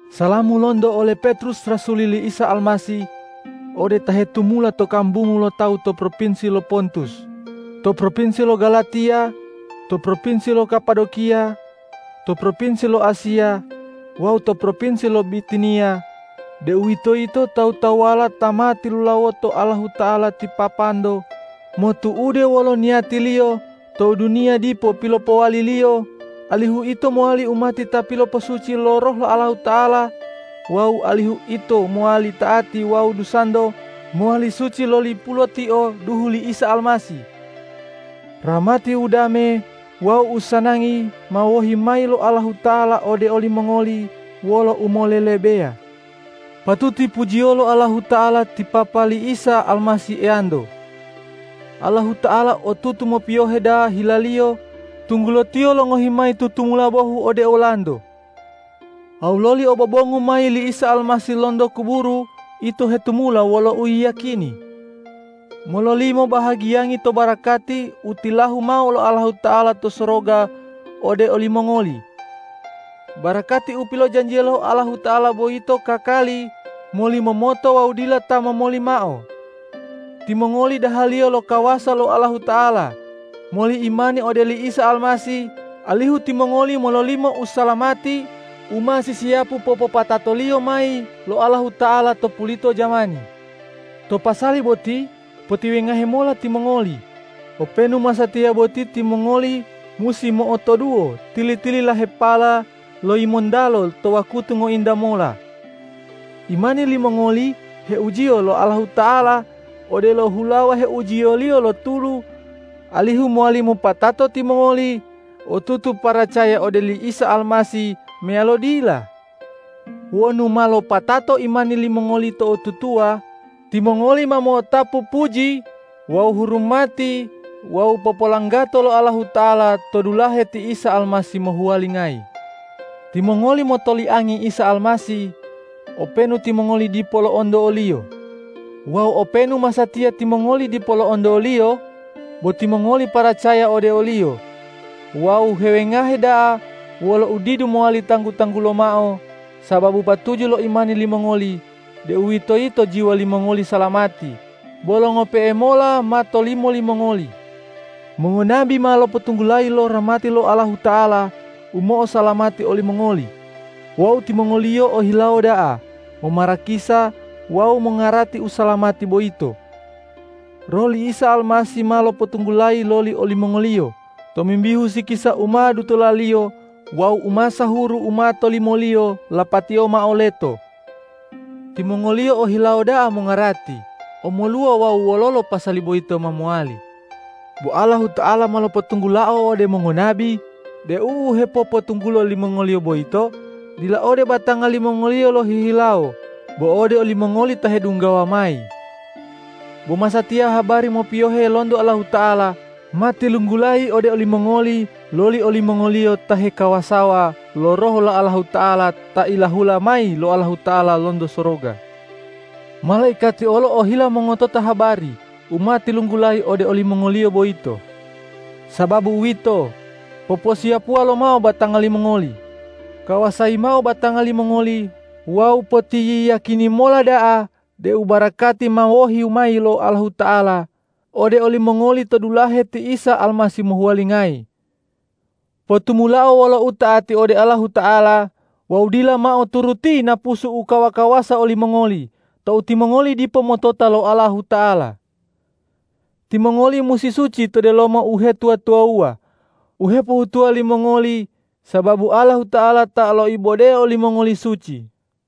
Salamu lonto ole Petrus rasul li Isa Almasih ode ta hetumula to kambungu lo tawu to propinsi lo Pontus, to propinsi lo Galatiya, to propinsi lo Kapadokiya, to propinsi lo Asiya wawu to propinsi lo Bitiniya, deuwitoyito tawu-tawuwala ta ma tilulawoto Allahuta'ala ti Papanto motu'ude wolo niyati-Liyo tou duniya dipo pilopowali-Liyo, alihu ito mowali umati ta piloposuci lo Roh lo Allahuta'ala wawu alihu ito mowali ta'ati wawu dusanto mowali suci loli pulotio duhu li Isa Almasih. Rahmati, udame wawu usanangi ma wohi mayi lo Allahuta'ala ode olimongoli wolo umolelebeya. Patuti pujiyolo Allahuta'ala ti Papa li Isa Almasih Eyanto! Allahuta'ala otutu mopiyohe da'a hila-Liyo, tunggulo Tiyo longohi mayi tutumula bohu ode olanto. Wawu loli obobongu mayi li Isa Almasih lonto kuburu, ito hetumula wolo uyiyakini mololimo bahagiyangi to barakati u tilahu mao lo Allahuta'ala to soroga ode olimongoli. Barakati u pilojanjiya lo Allahuta'ala boyito kakali, molimomoto wawu dila ta momoli mao. Timongoli dahaliyo lo kawasa lo Allahuta'ala moli imani ode oli Isa Almasih, alihu timongoli mololimo usalamati u ma sisiyapu popopatato-Liyo mayi lo Allahuta'ala to pulito jamani. To pasali boti potiwengahe mola timongoli, openu masatiya boti timongoli musi mo'otoduwo tili-tililahepala lo yimontalo to wakutu ngointa mola. Imani limongoli heujiyo lo Allahuta'ala odelo hulawa heujiyoliyo lo tulu, alihu mowali mopatato timongoli otutu paracaya ode oli Isa Almasih meyalo dila. Wonu ma lopatato imani limongoli to'otutuwa, timongoli ma mo'otapu puji wawu hurumati wawu popolanggato lo Allahuta'ala to dulahe ti Isa Almasih mohuwalingayi. Timongoli motoliangi Isa Almasih, openu timongoli dipo lo'onto o-Liyo. Wawu openu masatiya timongoli dipo lo'onto o-Liyo, bo timongoli paracaya ode o-Liyo wawu hewengahe da'a wolo udidu mowali tanggu-tanggulo mao, sababu patuju lo imani limongoli, deuwitoyito jiwa limongoli salamati, bolo ngope'e mola ma tolimo limongoli. Mongonabi ma lopotunggulayi lo rahmati lo Allahuta'ala u mo'osalamati olimongoli wawu timongoliyo ohilawo da'a momarakisa wawu mongarati usalamati boyito. Roh li Isa Almasih ma lopotunggulayi loli olimongoliyo tomimbihu sikisa u ma dutola-Liyo wawu umasahuru u ma tolimo-Liyo lapatiyo mao leto. Timongoliyo o hilawo da'a mongarati omoluwa wawu wololo pasali boyito ma mowali. Bo Allahuta'ala ma lopotunggulao ode mongonabi deu u hepopotunggulo limongoliyo boyito dila ode batanga limongoliyo lohihilawo bo ode olimongoli ta hedunggawa mayi. Bo masatiya habari mopiyohe lonto Allahuta'ala ma tilunggulayi ode olimongoli loli olimongoliyo ta hekawasawa lo Roh lo Allahuta'ala ta ilahula mayi lo Allahuta'ala lonto soroga. Malaikati olo ohila mongotota habari u ma tilunggulayi ode olimongoliyo boyito. Sababu uwito, poposiyapuwa lomao batanga limongoli. Kawasayi mao batanga limongoli wawu potiyiyakini mola da'a deu barakati ma wohi mayi lo Allahuta'ala ode olimongoli to dulahe ti Isa Almasih mohuwalingayi. Potumulao wolo uta'ati ode Allahuta'ala wawu dila mao turuti napusu u kawa-kawasa olimongoli tou timongoli dipo motota lo Allahuta'ala. Timongoli musi suci to delomo uhetuwa-tuwawuwa u hepohutuwo limongoli, sababu Allahuta'ala ta loibode olimongoli suci.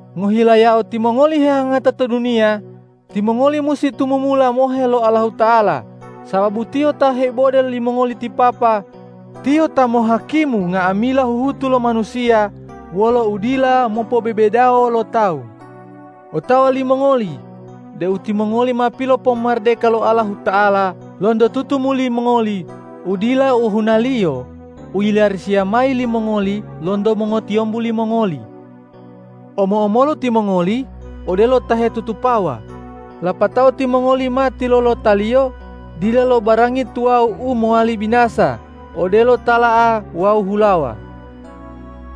Ngohilayao timongoli hehangata to duniya, timongoli musi tumumula mohe lo Allahuta'ala, sababu Tiyo ta heibode limongoli ti Papa, Tiyo ta mohakimu nga'amila huhutu lo manusiya wolo udila mopobebedawo lo tawu. Otawa limongoli deu timongoli ma pilopomaradeka lo Allahuta'ala lonto tutumuli mongoli u dila ohunaliyo u yilarisiya mayi limongoli lonto mongotiyombu limongoli. Omo-omolu timongoli odelo ta hetutupawa, lapatao timongoli ma tilolotaliyo dila lo barangi tuwawu u mowali binasa odelo tala'a wawu hulawa.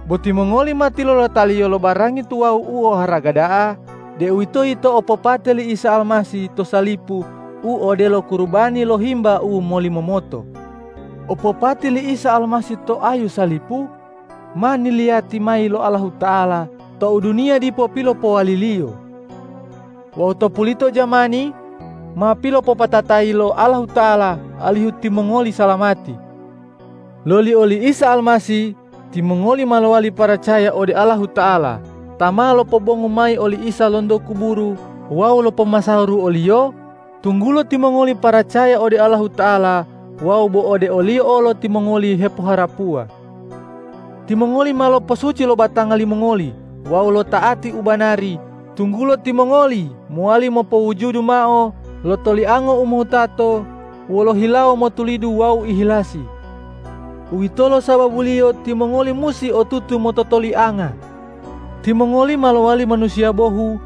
Bo timongoli ma tilolotaliyo lo barangi tuwawu u oharaga da'a, deuwitoyito opopate li Isa Almasih to salipu u odelo kurubani lo himba u molimomoto. Opopate li Isa Almasih to ayu salipu, ma niliyati mayi lo Allahuta'ala tou duniya dipo pilopowali-Liyo. Wawu to pulito jamani ma pilopopatatayi lo Allahuta'ala alihu timongoli salamati. Loli oli Isa Almasih timongoli ma lowali paracaya ode Allahuta'ala ta ma lopobongu mayi oli Isa lonto kuburu wawu lopomasahuru o-Liyo, tunggulo timongoli paracaya ode Allahuta'ala wawu bo ode o-Liyo olo timongoli hepoharapuwa. Timongoli ma loposuci lo batanga limongoli wawu lota'ati ubanari, tunggulo timongoli mowali mopowujudu mao lo toliango u mohutato wolo hilawo motulidu wawu ihilasi. Uwitolo sababuliyo timongoli musi otutu mototolianga. Timongoli ma lowali manusiya bohu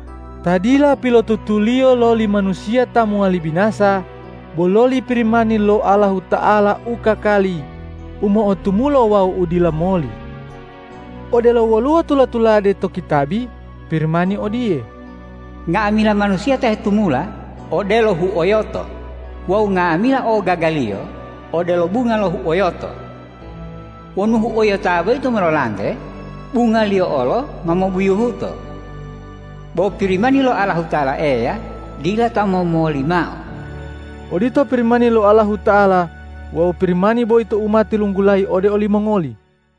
ta dila pilotutuliyo loli manusiya ta mowali binasa, bo loli Pirimani lo Allahuta'ala u kakali, u mo'otumulo wawu u dila moli. Odelo woluwo tula-tulade to kitabi Pirimani odiye,”Nga'amila manusiya ta hetumula odelo huoyoto wawu nga'amila ogagaliyo odelo bunga lo huoyoto. Wonu huoyota boyito mololante, bungaliyo olo ma mobuyuhuto. Bo Pirimani lo Allahuta'ala Eya dila ta momoli mao.” Odito Pirimani lo Allahuta'ala wawu Pirimani boyito u ma tilunggulayi ode olimongoli.